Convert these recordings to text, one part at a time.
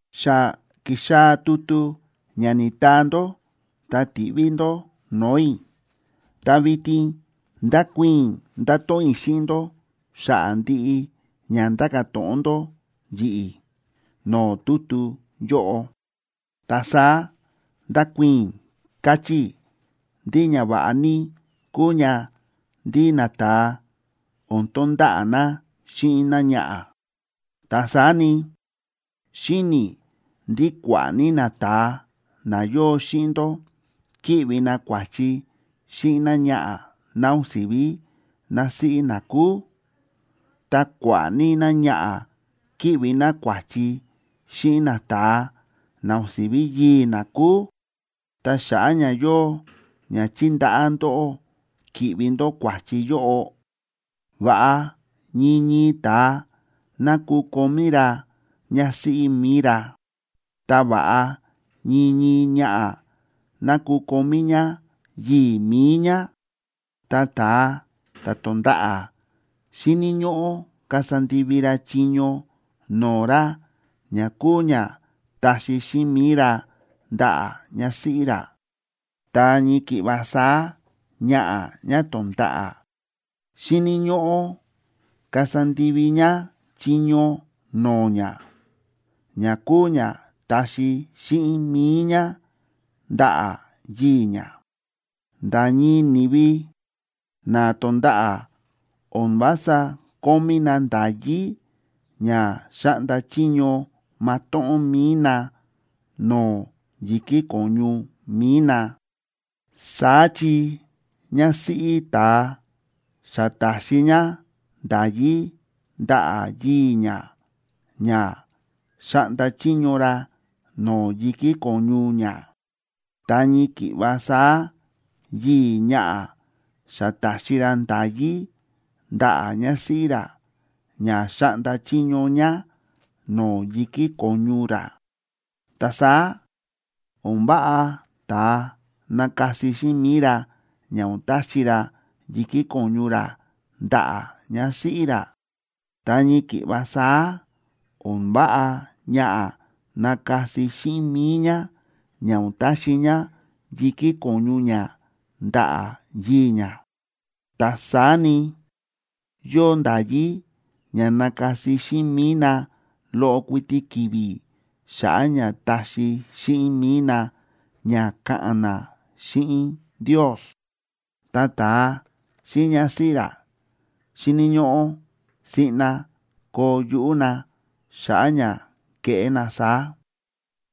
Xa ki̱xaa̱ tutu ña ni̱taa ndó ta ti̱ꞌví ndó no̱o̱ i̱, ta vitin ndakuii̱n i̱, ndato̱ꞌon i̱ xíꞌin ndó xa̱ꞌa̱ ndiꞌi ña ndáka̱ to̱ꞌon ndó yi̱ꞌi̱ no̱o̱ tutu yóꞌo. Ta saá ndákuii̱n i̱ káchí i̱ ndí ñava̱ꞌa ní kúu ña ndí nata̱a o̱n tonda̱ꞌa̱ na xíꞌin náñaꞌa̱. Ta saá ni, xíni̱ i̱ ndí kua̱ꞌa̱ ní nata̱a na yóo xíꞌin ndó kíꞌvi na kua̱chi xíꞌin náñaꞌa̱ ná o̱n si̱ví násíꞌí na kúu, ta kua̱ꞌa̱ ní náñaꞌa̱ kíꞌvi ná kua̱chi xíꞌin nata̱a na o̱n si̱ví yii̱ ná kúu, ta xa̱ꞌa̱ ña yóo ña chíndaꞌá ndóꞌó ki̱ꞌvi ndó kua̱chi yóꞌo, va̱ꞌa ñii ñii ta̱a ná kukomí ra ñásíꞌí mi̱i ra, ta va̱ꞌa ñii ñii ñaꞌa̱ ná kukomí ñá yii̱ mi̱i ñá. Ta ta̱a ta̱ to̱nda̱ꞌa̱ xíni̱ ñóꞌó kasa ndivi ra chiño no̱o̱ ra ña kúu ña taxi xíꞌin mi̱i ra ndaꞌa̱ ñásíꞌí ra, ta ñii ki̱ꞌva saá, ñaꞌa̱ ñá to̱nda̱ꞌa̱ xíni̱ ñóꞌó kasa ndivi ñá chiño no̱o̱ ñá, ña kúu ña taxi xíꞌin mi̱i ñá ndaꞌa̱ yii̱ ñá. Nda̱ ñii ni̱vi na to̱nda̱ꞌa̱ o̱n vása kómí na nda̱yí ña xáꞌnda chiño matóꞌón mi̱i na no̱o̱ yi̱kí ko̱ñu mi̱i na. Saá chi ñásíꞌí ta̱a xa ta̱xi ñá nda̱yí ndaꞌa̱ yii̱ ñá ña xáꞌnda chiño ra no̱o̱ yi̱kí ko̱ñu ñá. Ta ñii ki̱ꞌva saá yii̱ ñaꞌa̱ xa ta̱xi ra nda̱yí ndaꞌa̱ ñásíꞌí ra ña xáꞌnda chiño ñá no̱o̱ yi̱kí ko̱ñu ra. Ta saá o̱n váꞌa ta̱a nakasi xíꞌin mi̱i ra ña o̱n taxi ra yi̱kí ko̱ñu ra ndaꞌa̱ ñásíꞌí ra. Ta ñii ki̱ꞌva saá, o̱n váꞌa ñaꞌa̱ nakasi xíꞌin mi̱i ñá ña o̱n taxi ñá yi̱kí ko̱ñu ñá ndaꞌa̱ yii̱ ñá. Ta saá ni, yóo nda̱yí ña nakasi xíꞌin mi̱i na loꞌo kuiti ki̱vi̱ xa̱ꞌa̱ ña taxi xíꞌin mi̱i na ña ka̱ꞌa̱n na xíꞌin Ndios. Ta ta̱a xíꞌin ñásíꞌí ra xíni̱ ñóꞌó siꞌna koo yuꞌú na xa̱ꞌa̱ ña keꞌé na saá.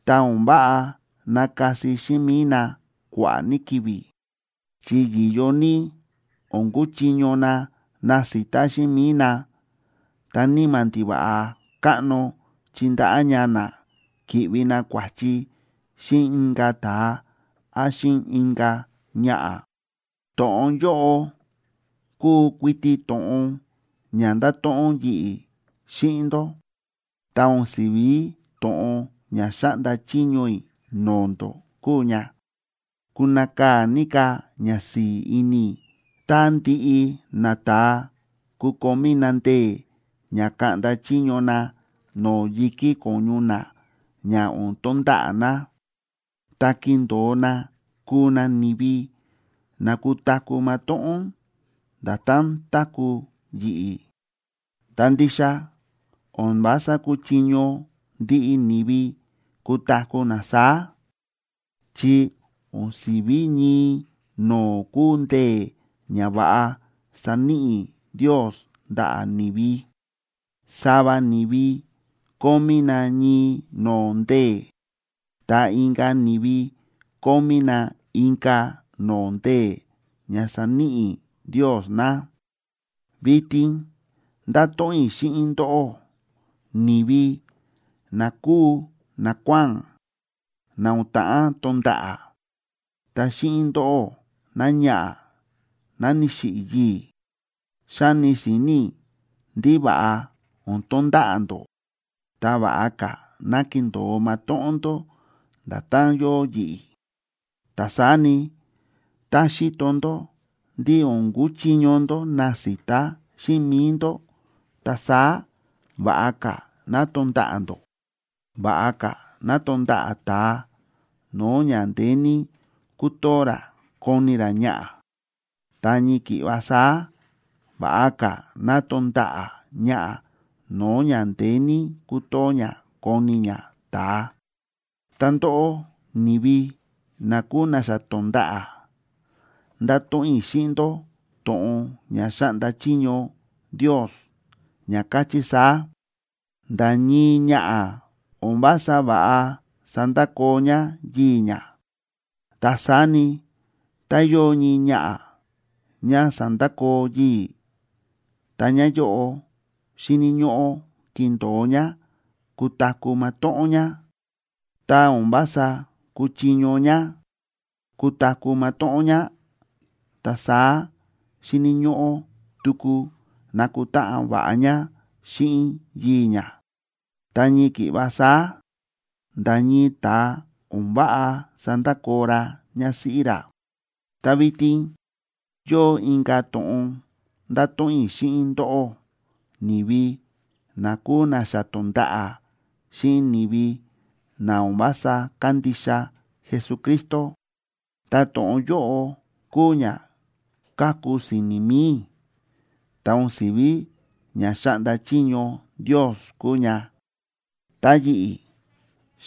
Ta o̱n váꞌa nakasi xíꞌin mi̱i na kua̱ꞌa̱ ní ki̱vi̱, chi yi̱yo ní o̱n kuchiño na nasita xíꞌin mi̱i na, ta níma̱ ndiva̱ꞌa káꞌno chindaꞌá ña na ki̱ꞌvi na kua̱chi xíꞌin inka̱ ta̱a án xíꞌin inka̱ ñaꞌa̱. To̱ꞌon yóꞌo kúu kuiti to̱ꞌon ña ndáto̱ꞌon yi̱ꞌi̱ xíꞌin ndó, ta o̱n si̱ví to̱ꞌon ña xáꞌnda chiño i̱ no̱o̱ ndó kúu ña. Kunakaa̱ ní ka̱ ñasi̱i̱ ini i̱ tá ndiꞌi nata̱a kukomí na ndee̱ ña kaꞌnda chiño na no̱o̱ yi̱kí ko̱ñu na ña o̱n tonda̱ꞌa̱ na, ta kindo̱o na kuu na ni̱vi na kutaku̱ matóꞌón, nda̱tán táku̱ yi̱ꞌi̱. Ta ndixa o̱n vása kúchiño ndiꞌi ni̱vi kutaku̱ na saá, chi o̱n si̱ví ñii no̱o̱ kúu ndee̱ ña va̱ꞌa sa̱níꞌi Ndios ndaꞌa̱ ni̱vi. Sava ni̱vi kómí na ñii no̱o̱ ndee̱, ta inka̱ ni̱vi kómí na inka̱ no̱o̱ ndee̱ ña sa̱níꞌi Ndios na. Vitin ndáto̱ꞌon i̱ xíꞌin ndóꞌó, ni̱vi na kúu nakuáa̱n na o̱n ta̱ꞌán tonda̱ꞌa̱, ta xíꞌin ndóꞌó, náñaꞌa̱ ná ni̱xiꞌi̱ yii̱. Xáni si̱ni̱ i̱ ndí va̱ꞌa o̱n tonda̱ꞌa̱ ndó, ta va̱ꞌa ka̱ ná kindo̱o matóꞌón ndó nda̱tán yóo yi̱ꞌi̱. Ta saá ni, tá xíto ndó ndí o̱n kuchiño ndó nasita xíꞌin mi̱i ndó, ta saá va̱ꞌa ka̱ ná tonda̱ꞌa̱ ndó. Va̱ꞌa ka̱ ná tonda̱ꞌa̱ ta̱a no̱o̱ ña ndeé ní kútoo ra kóni ra ñaꞌa̱, ta ñii ki̱ꞌva saá va̱ꞌa ka̱ ná tonda̱ꞌa̱ ñaꞌa̱ no̱o̱ ña ndeé ní kútoo ñá kóni ñá ta̱a. Ta ndóꞌó, ni̱vi na kúu na xa to̱nda̱ꞌa̱, ndáto̱ꞌon i̱ xíꞌin ndó to̱ꞌon ña xáꞌnda chiño Ndios, ña káchí saá: “Nda̱ ñii ñaꞌa̱ o̱n vása va̱ꞌa sandakoo ñá yii̱ ñá.” Ta saá ni, tá yóo ñii ñaꞌa̱ ñá sa̱ndakoo yii̱, ta ñaꞌa̱ yóꞌo xíni̱ ñóꞌó kindo̱o ñá kutaku̱ matóꞌón ñá. Tá o̱n vása kúchiño ñá kutaku̱ matóꞌón ñá, ta saá xíni̱ ñóꞌó tuku nakutáꞌan va̱ꞌa ñá xíꞌin yii̱ ñá. Ta ñii ki̱ꞌva saá, nda̱ ñii ta̱a o̱n váꞌa sandakoo ra ñásíꞌí ra. Ta vitin yóo inka̱ to̱ꞌon ndáto̱ꞌon i̱ xíꞌin ndóꞌó, ni̱vi na kúu na xa to̱nda̱ꞌa̱ xíꞌin ni̱vi na o̱n vása kándixa Jesucristo. Ta to̱ꞌon yóꞌo kúu ña káku si̱ni̱ mi̱i i̱, ta o̱n si̱ví ña xáꞌnda chiño Ndios kúu ña. Ta yi̱ꞌi̱,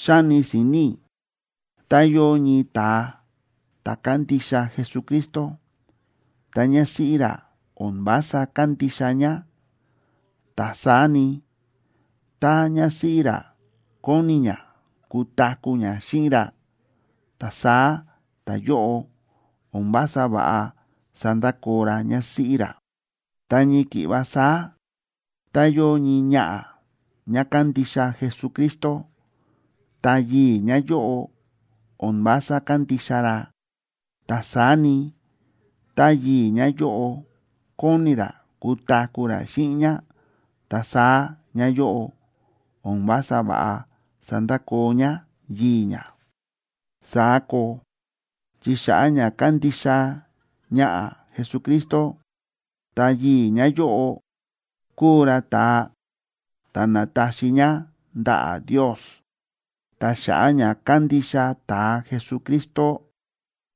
xáni si̱ni̱ i̱ tá yóo ñii ta̱a ta̱ kándixa Jesucristo, ta ñásíꞌí ra o̱n vása kándixa ñá, ta saá ni, tá ñásíꞌí ra kóni ñá kutaku̱ ñá xíꞌin ra, ta saá ta̱yóꞌo o̱n vása va̱ꞌa sandakoo ra ñásíꞌí ra. Ta ñii ki̱ꞌva saá, tá yóo ñii ñaꞌa̱ ñá kándixa Jesucristo, ta yii̱ ñáyóꞌo o̱n vása kándixa ra, ta saá ni, tá yii̱ ñáyóꞌo kóni ra kutaku̱ ra xíꞌin ñá, ta saá ñáyóꞌo o̱n vása va̱ꞌa sandakoo ñá yii̱ ñá. Saá koo, chi xa̱ꞌa̱ ña kándixa ñaꞌa̱ Jesucristo, ta ta̱yii̱ ñáyóꞌo, kúu ra ta̱a ta̱ na̱taxi ñá ndaꞌa̱ Ndios. Ta xa̱ꞌa̱ ña kándixa ta̱a Jesucristo,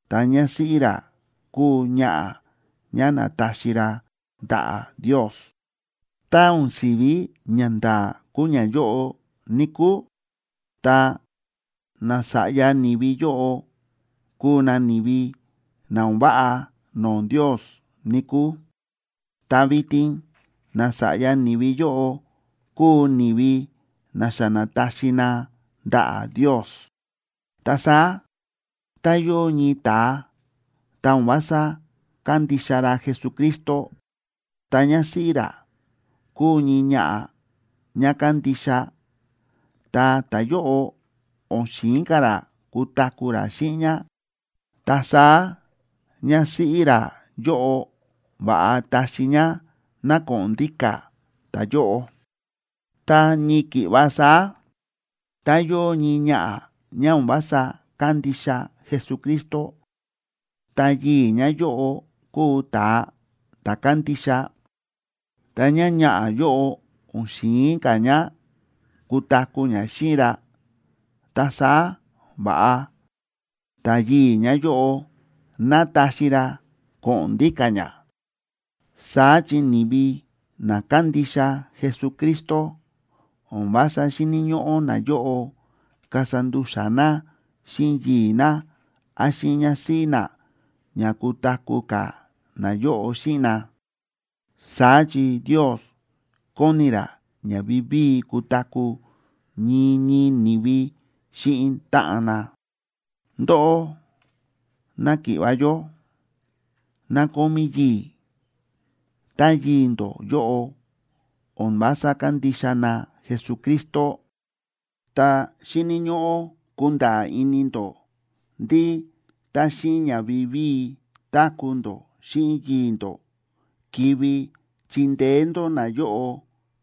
ta ñásíꞌí ra kúu ñaꞌa̱ ñá na̱taxi ra ndaꞌa̱ Ndios. Tá o̱n si̱ví ñanda̱a̱ kúu ñayóꞌo, níkúu, ta nasa̱ꞌya ni̱vi yóꞌo kuu na ni̱vi na o̱n váꞌa no̱o̱ Ndios, níkúu. Ta vitin nasa̱ꞌya ni̱vi yóꞌo kúu ni̱vi na xa na̱taxi na ndaꞌa̱ Ndios. Ta saá, tá yóo ñii ta̱a, ta o̱n vása kándixa ra Jesucristo, ta ñásíꞌí ra kúu ñii ñaꞌa̱ ñá kándixa, ta ta̱yóꞌo o̱n xi̱in ka̱ ra kutaku̱ ra xíꞌin ñá, ta saá ñásíꞌí ra yóꞌo va̱ꞌa taxi ñá ná ko̱ꞌo̱n ndíka̱ ta̱yóꞌo. Ta ñii ki̱ꞌva saá, tá yóo ñii ñaꞌa̱ ñá o̱n vása kándixa Jesucristo, ta yii̱ ñáyóꞌo kúu ta̱a ta̱ kándixa, ta ñáñaꞌa̱ yóꞌo o̱n xi̱in ka̱ ñá kutaku̱ ñá xíꞌin ra, ta saá va̱ꞌa ta̱yii̱ ñáyóꞌo ná taxi ra ko̱ꞌo̱n ndíka̱ ñá. Saá chi ni̱vi na kándixa Jesucristo o̱n vása xíni̱ ñóꞌó nayóꞌo kasa ndu̱xa̱ na xíꞌin yii̱ ná án xíꞌin ñásíꞌí na ña kutaku̱ ka̱ nayóꞌo xíꞌin na. Saá chi Ndios kóni ra ña vivíi kutaku̱ ñii ñii ni̱vi xíꞌin táꞌan na. Ndóꞌó náki̱ꞌva̱ yó, ná kómí yii̱, ta yii̱ ndó yóꞌo o̱n vása kándixa na Jesucristo, ta xíni̱ ñóꞌó kunda̱a̱ ini ndó ndí tá xíꞌin ña vivíi táku̱ ndó xíꞌin yii̱ ndó, kivi chindeé ndó nayóꞌo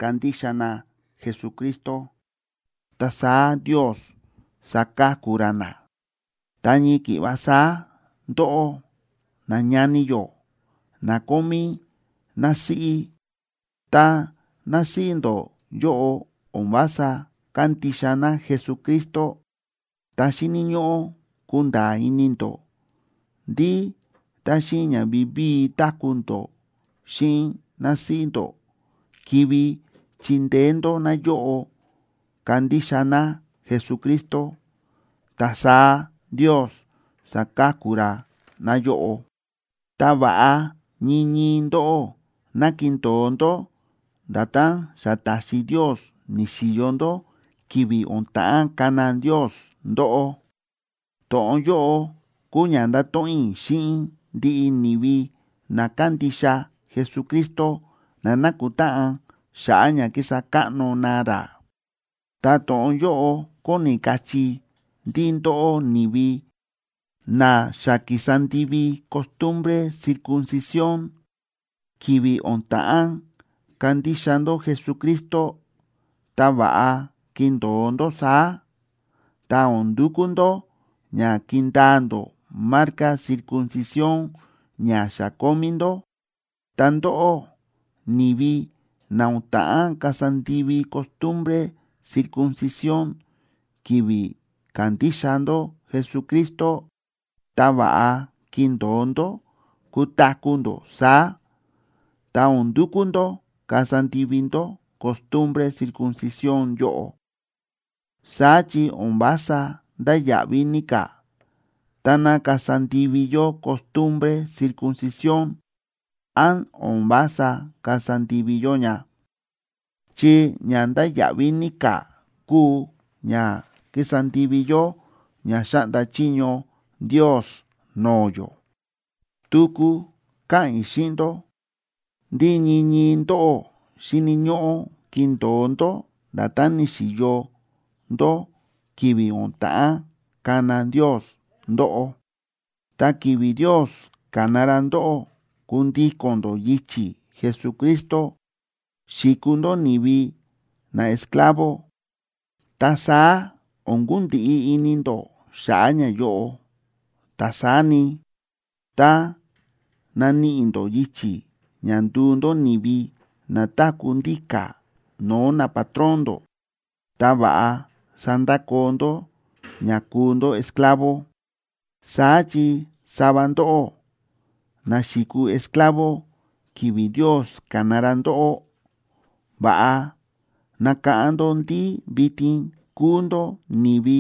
kandixa na Jesucristo, ta saá Ndios saka̱ku ra na. Ta ñii ki̱ꞌva saá ndóꞌó, nañani yó na kómí násíꞌí, ta násíꞌí ndó yóꞌo o̱n vása kándixa ná Jesucristo, ta xíni̱ ñóꞌó kunda̱a̱ ini ndó ndí tá xíꞌin ña vivíi táku̱ ndó xíꞌin násíꞌí ndó, kivi chindeé ndó náyóꞌo kandixa ná Jesucristo, ta saá Ndios saka̱ku ra náyóꞌo. Ta va̱ꞌa ñii ñii ndóꞌó ná kindo̱o ndó nda̱tán xa ta̱xi Ndios ni̱xi̱yo ndó ki̱vi̱ o̱n ta̱ꞌán kana Ndios ndóꞌó. To̱ꞌon yóꞌo kúu ña ndáto̱ꞌon i̱ xíꞌin ndiꞌi ni̱vi na kándixa Jesucristo na nákutáꞌan xa̱ꞌa̱ ña kísa káꞌno na ra. Ta to̱ꞌon yóꞌo kóni kachí ndí ndóꞌó ni̱vi na xa ki̱sa ndivi costumbre circuncisióna ki̱vi̱ o̱n ta̱ꞌán kandixa ndó Jesucristo, ta va̱ꞌa kindo̱o ndó saá, ta o̱n ndukú ndó ña kindaa ndó marca circuncisión ña xa kómí ndó. Ta ndóꞌó, ni̱vi na o̱n ta̱ꞌán kasa ndivi costumbre circuncisión ki̱vi̱ ka̱ndixa ndó Jesucristo, ta va̱ꞌa kindo̱o ndó kutaku̱ ndó saá, ta o̱n ndukú ndó kasa ndivi ndó costumbre circuncisión yóꞌo. Saá chi o̱n vása ndáya̱ꞌví ní ka̱, táná kasa ndivi yó costumbre circuncisión, án o̱n vása kasa ndivi yó ña, chi ña ndáya̱ꞌví ní ka̱ kúu ña kísa ndivi yó ña xáꞌnda chiño Ndios no̱o̱ yó. Tuku káꞌa̱n i̱ xíꞌin ndó ndí ñii ñii ndóꞌó xíni̱ ñóꞌó kindo̱o ndó nda̱tán ni̱xi̱yo ndó ki̱vi̱ o̱n ta̱ꞌán kana Ndios ndóꞌó. Tá ki̱vi̱ Ndios ka̱na ra ndóꞌó kundíko̱n ndó yichi̱ Jesucristo, xi̱kuu ndó ni̱vi naesclavo,b ta saá o̱n kundiꞌi ini ndó xa̱ꞌa̱ ñayóꞌo. Ta saá ni, tá naníꞌi ndó yichi̱ ña nduu ndó ni̱vi na táku̱ ndíka̱ no̱o̱ napatrón ndó, ta va̱ꞌa sandakoo ndó ña kúu ndó esclavo. Saá chi sava ndóꞌó, na xi̱kuu esclavo ki̱vi̱ Ndios ka̱na ra ndóꞌó, va̱ꞌa nakáꞌán ndó ndí vitin kúu ndó ni̱vi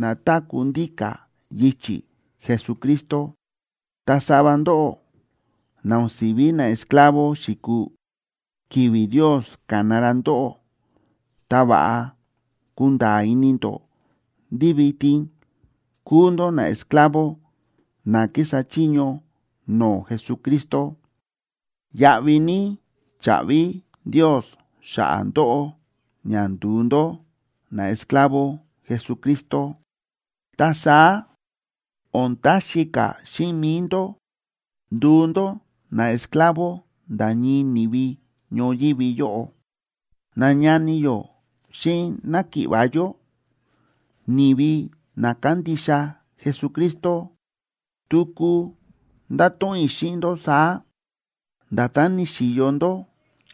na táku̱ ndíka̱ yichi̱ Jesucristo. Ta sava ndóꞌó, na o̱n si̱ví naesclavo xi̱kuu ki̱vi̱ Ndios ka̱na ra ndóꞌó, ta va̱ꞌa kunda̱a̱ ini ndó ndí vitin kúu ndó naesclavo na kísa chiño no̱o̱ Jesucristo. Yáꞌví ní cha̱ꞌvi Ndios xa̱ꞌa̱ ndóꞌó ña ndu̱u ndó naesclavo Jesucristo, ta saá o̱n taxi ka̱ xíꞌin mi̱i ndó nduu ndó naesclavo nda̱ ñii ni̱vi ñoyívi yóꞌo. Nañani yó xíꞌin náki̱ꞌva̱ yó, ni̱vi na kándixa Jesucristo, tuku ndáto̱ꞌon i̱ xíꞌin ndó saá: Nda̱tán ni̱xi̱yo ndó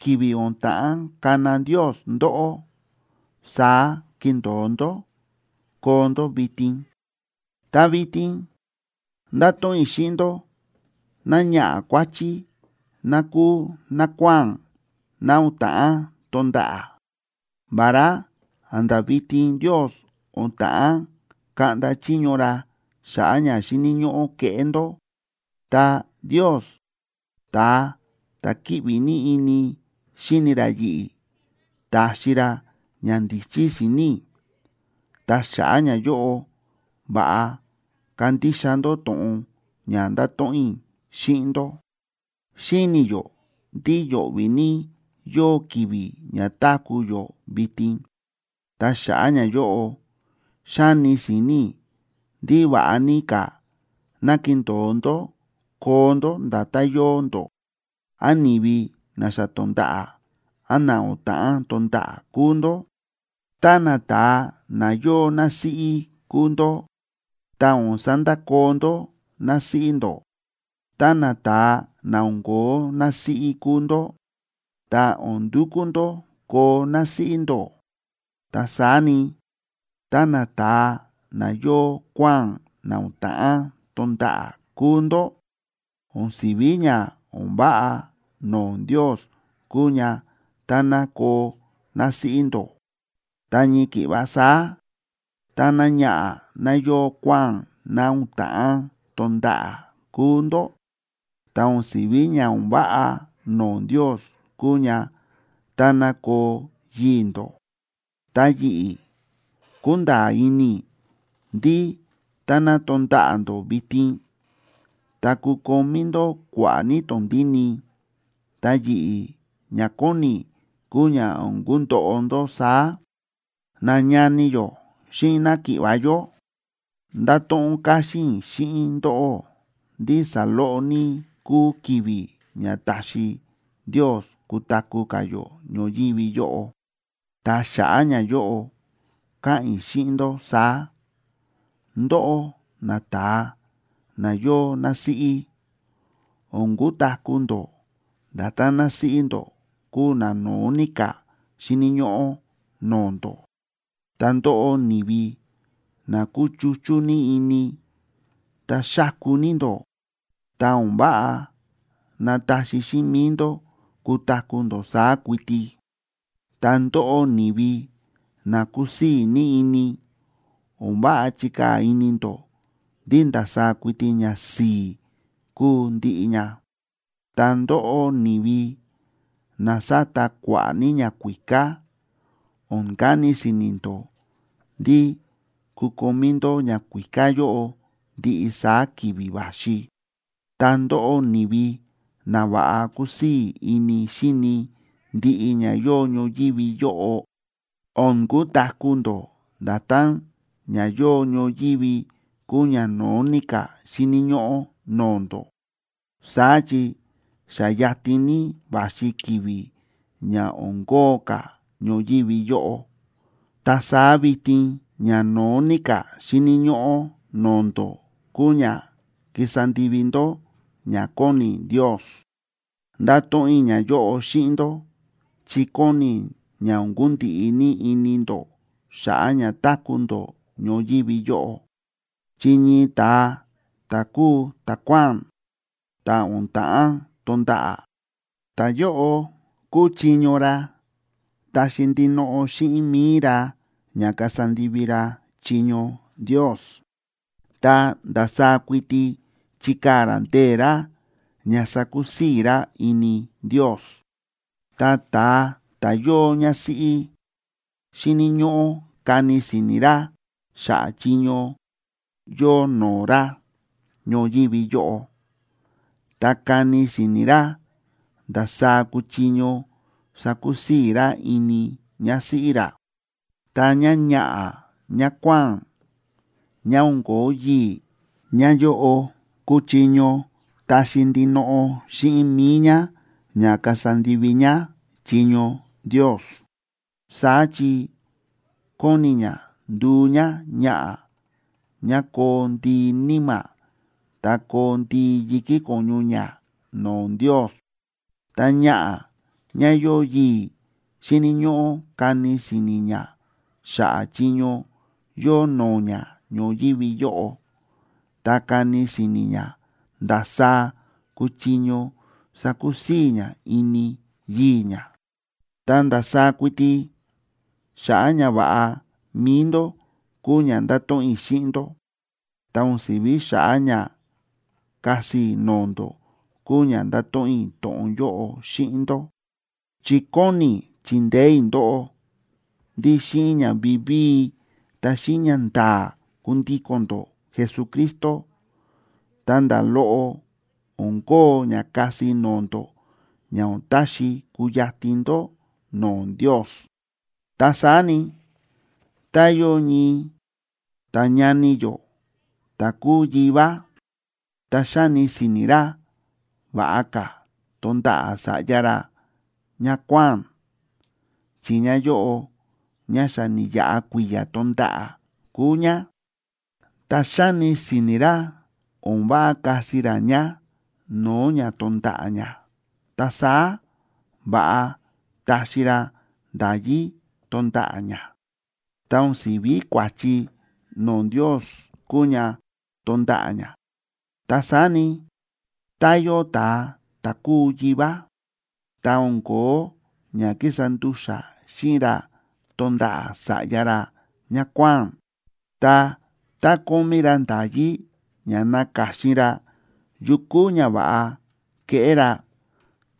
ki̱vi̱ o̱n ta̱ꞌán kana Ndios ndóꞌó, saá kindo̱o ndó koo ndó vitin. Ta vitin ndáto̱ꞌon i̱ xíꞌin ndó náñaꞌa̱ kuáchí ná kúu nákuáa̱n ná o̱n ta̱ꞌán tonda̱ꞌa̱. Vará a̱nda̱ vitin Ndios o̱n ta̱ꞌán kaꞌnda chiño ra xa̱ꞌa̱ ña xíni̱ ñóꞌó keꞌé ndó, ta Ndios, ta̱a ta̱ kíꞌvi ní ini xíni ra yi̱ꞌi̱, ta̱xi ra ñandíchí si̱ni̱ i̱. Ta xa̱ꞌa̱ ñayóꞌo, va̱ꞌa kandixa ndó to̱ꞌon ña ndáto̱ꞌon i̱ xíꞌin ndó. Xíni̱ yó ndí yo̱ꞌvi̱ ní yóo ki̱vi̱ ña táku̱ yó vitin. Ta xa̱ꞌa̱ ñayóꞌo, xáni si̱ni̱ i̱ ndí va̱ꞌa ní ka̱ ná kindo̱o ndó koo ndó nda̱tán yóo ndó, án ni̱vi na xa to̱nda̱ꞌa̱, án na o̱n ta̱ꞌán tonda̱ꞌa̱ kúu ndó. Tá nata̱a na yóo násíꞌí kúu ndó, ta o̱n sandakoo ndó násíꞌí ndó. Tá nata̱a na o̱n ko̱ó násíꞌí kúu ndó, ta o̱n ndukú ndó koo násíꞌí ndó. Ta saá ni, tá nata̱a na yóo kuáa̱n na o̱n ta̱ꞌán tonda̱ꞌa̱ kúu ndó, o̱n si̱ví ña o̱n váꞌa no̱o̱ Ndios kuu ña táná koo násíꞌí ndó. Ta ñii ki̱ꞌva saá, tá náñaꞌa̱ ná yóo kuáa̱n ná o̱n ta̱ꞌán tonda̱ꞌa̱ kúu ndó, ta o̱n si̱ví ña o̱n váꞌa no̱o̱ Ndios kuu ña táná koo yii̱ ndó. Ta yi̱ꞌi̱, kúnda̱a̱ ini i̱ ndí táná tonda̱ꞌa̱ ndó vitin, ta kukomí ndó kua̱ꞌa̱ ní tondíni, ta yi̱ꞌi̱ ña kóni i̱ kúu ña o̱n kundoꞌo ndó saá. Nañani yó xíꞌin náki̱ꞌva̱ yó, ndáto̱ꞌon káxín i̱ xíꞌin ndóꞌó ndí saloꞌo ní kúu ki̱vi̱ ña taxi Ndios kutaku̱ ka̱ yó ñoyívi yóꞌo. Ta xa̱ꞌa̱ ñayóꞌo káꞌa̱n i̱ xíꞌin ndó saá: Ndóꞌó nata̱a na yóo násíꞌí, o̱n kutaku̱ ndó nda̱tán násíꞌí ndó kúu ná no̱ó ní ka̱ xíni̱ ñóꞌó no̱o̱ ndó. Ta ndóꞌó ni̱vi na kúchuchú ní ini ta xáku ní ndó, ta o̱n váꞌa nataxi xíꞌin mi̱i ndó kutaku̱ ndó saá kuiti. Ta ndóꞌó ni̱vi na kúsii̱ ní ini, o̱n váꞌa chikaa̱ ini ndó ndí ndasaá kuiti ñasi̱i̱ kúu ndiꞌi ña. Ta ndóꞌó, ni̱vi na sáta kua̱ꞌa̱ ní ñakuíká, o̱n kani si̱ni̱ ndó ndí kukomí ndó ñakuíká yóꞌo ndiꞌi saá ki̱vi̱ va̱xi. Ta ndóꞌó, ni̱vi na va̱ꞌa kúsii̱ ini xíni ndiꞌi ña yóo ñoyívi yóꞌo, o̱n kutaku̱ ndó nda̱tán ña yóo ñoyívi kúu ñano̱ó ní ka̱ xíni̱ ñóꞌó no̱o̱ ndó. Saá chi xa yatin ní va̱xi ki̱vi̱ ña o̱n kóo ka̱ ñoyívi yóꞌo, ta saá vitin ñano̱ó ní ka̱ xíni̱ ñóꞌó no̱o̱ ndó kúu ña kísa ndivi ndó ña kóni Ndios. Ndáto̱ꞌon i̱ ñayóꞌo xíꞌin ndó chi kóni i̱ ña o̱n kundiꞌi ní ini ndó xa̱ꞌa̱ ña táku̱ ndó ñoyívi yóꞌo. Chi ñii ta̱a ta̱ kúu ta̱kuáa̱n, ta̱ o̱n ta̱ꞌán tonda̱ꞌa̱, ta̱yóꞌo kúchiño ra taxi ndinoꞌo xíꞌin mi̱i ra ña kasa ndivi ra chiño Ndios, ta ndasaá kuiti chikaa̱ ra ndee̱ ra ña sakusii̱ ra ini Ndios. Ta ta̱a ta̱ yóo ñásíꞌí, xíni̱ ñóꞌó kani si̱ni̱ ra xa̱ꞌa̱ chiño yóo no̱o̱ ra ñoyívi yóꞌo, ta kani si̱ni̱ ra ndasaá kuchiño sakusii̱ ra ini ñásíꞌí ra. Ta ñáñaꞌa̱ ñákuáa̱n, ñá o̱n ko̱ó yii̱, ñáyóꞌo kúchiño taxi ndinoꞌo xíꞌin mi̱i ñá ña kasa ndivi ñá chiño Ndios, saá chi kóni ñá nduu ñáñaꞌa̱ ñá koo ndii níma̱ ta koo ndii yi̱kí ko̱ñu ñá no̱o̱ Ndios. Ta ñaꞌa̱ ñá yóo yii̱ xíni̱ ñóꞌó kani si̱ni̱ ñá xa̱ꞌa̱ chiño yóo no̱o̱ ñá ñoyívi yóꞌo, ta kani si̱ni̱ ñá ndasaá kuchiño sakusii̱ ñá ini yii̱ ñá. Ta ndasaá kuiti xa̱ꞌa̱ ñava̱ꞌa mi̱i ndó kúu ña ndáto̱ꞌon i̱ xíꞌin ndó, ta o̱n si̱ví xa̱ꞌa̱ ña kasi i̱ no̱o̱ ndó kúu ña ndáto̱ꞌon i̱ to̱ꞌon yóꞌo xíꞌin ndó. Chi kóni i̱ chindeé i̱ ndóꞌó ndí xíꞌin ña vivíi ta xíꞌin ñanda̱a̱ kundíko̱n ndó Jesucristo, ta nda̱ loꞌo o̱n kóo ña kasi no̱o̱ ndó ña o̱n taxi kuyatin ndó no̱o̱ Ndios. Ta saá ni, tá yóo ñii ta̱ñani yó ta̱ kúu yivá, ta xáni si̱ni̱ ra va̱ꞌa ka̱ tonda̱ꞌa̱ sa̱ꞌya ra ñákuáa̱n, chi ñáyóꞌo ñá xa ni̱yaꞌa kui̱ya̱ tonda̱ꞌa̱ kúu ñá, ta xáni si̱ni̱ ra o̱n váꞌa kasi ra ñá no̱o̱ ña tonda̱ꞌa̱ ñá, ta saá va̱ꞌa taxi ra nda̱yí tonda̱ꞌa̱ ñá. Ta o̱n si̱ví kua̱chi no̱o̱ Ndios kúu ña tonda̱ꞌa̱ ñá. Ta saá ni, tá yóo ta̱a ta̱ kúu yivá, ta o̱n ko̱ó ña kísa ndu̱xa̱ xíꞌin ra tonda̱ꞌa̱ sa̱ꞌya ra ñákuáa̱n, ta tá kómí ra nda̱yí ña naka̱xin ra yu kúu ña va̱ꞌa keꞌé ra,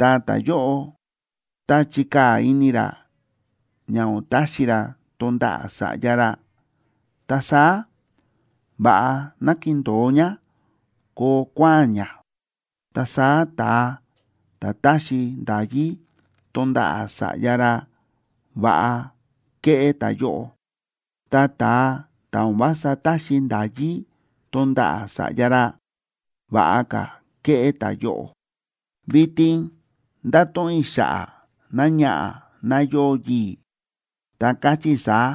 ta ta̱yóꞌo tá chikaa̱ ini ra ña o̱n taxi ra tonda̱ꞌa̱ sa̱ꞌya ra, ta saá va̱ꞌa ná kindo̱o ñá koo kuáa̱n ñá. Ta saá ta̱a ta̱ táxi nda̱yí tonda̱ꞌa̱ sa̱ꞌya ra va̱ꞌa kéꞌé ta̱yóꞌo, ta ta̱a ta̱ o̱n vása táxi nda̱yí tonda̱ꞌa̱ sa̱ꞌya ra, va̱ꞌa ka̱ kéꞌé ta̱yóꞌo. Vitin ndáto̱ꞌon i̱ xa̱ꞌa̱ náñaꞌa̱ ná yóo yii̱, ta káchí i̱ saá: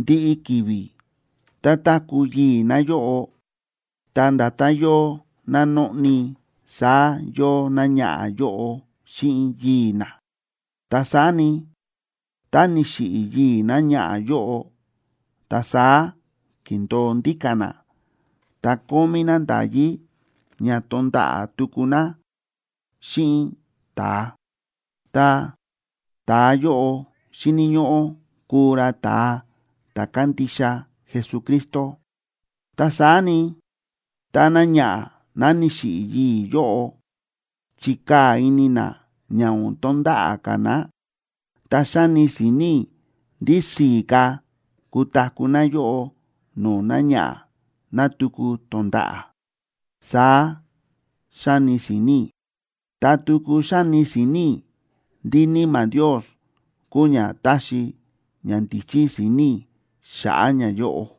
Ndiꞌi ki̱vi̱ tá táku̱ yii̱ náyóꞌo, ta nda̱tán yóo ná nóꞌni, saá yóo náñaꞌa̱ yóꞌo xíꞌin yii̱ ná. Ta saá ni, tá ni̱xiꞌi̱ yii̱ náñaꞌa̱ yóꞌo, ta saá kíndo̱o ndíka̱ ná, ta kómí ná nda̱yí ña tonda̱ꞌa̱ tuku ná xíꞌin ta̱a, ta ta̱a yóꞌo xíni̱ ñóꞌó kuu ra ta̱a ta̱ kándixa Jesucristo. Ta saá ni, tá náñaꞌa̱ ná ni̱xiꞌi̱ yii̱ yóꞌo chikaa̱ ini ná ña o̱n tonda̱ꞌa̱ ka̱ ná, ta xáni si̱ni̱ i̱ ndí si̱i̱ ka̱ kutaku̱ náyóꞌo no̱o̱ náñaꞌa̱ ná tuku tonda̱ꞌa̱. Saá xáni si̱ni̱ i̱, ta tuku xáni si̱ni̱ i̱ ndí Níma̱ Ndios kúu ña táxi ñandíchí si̱ni̱ i̱ xa̱ꞌa̱ ñayóꞌo.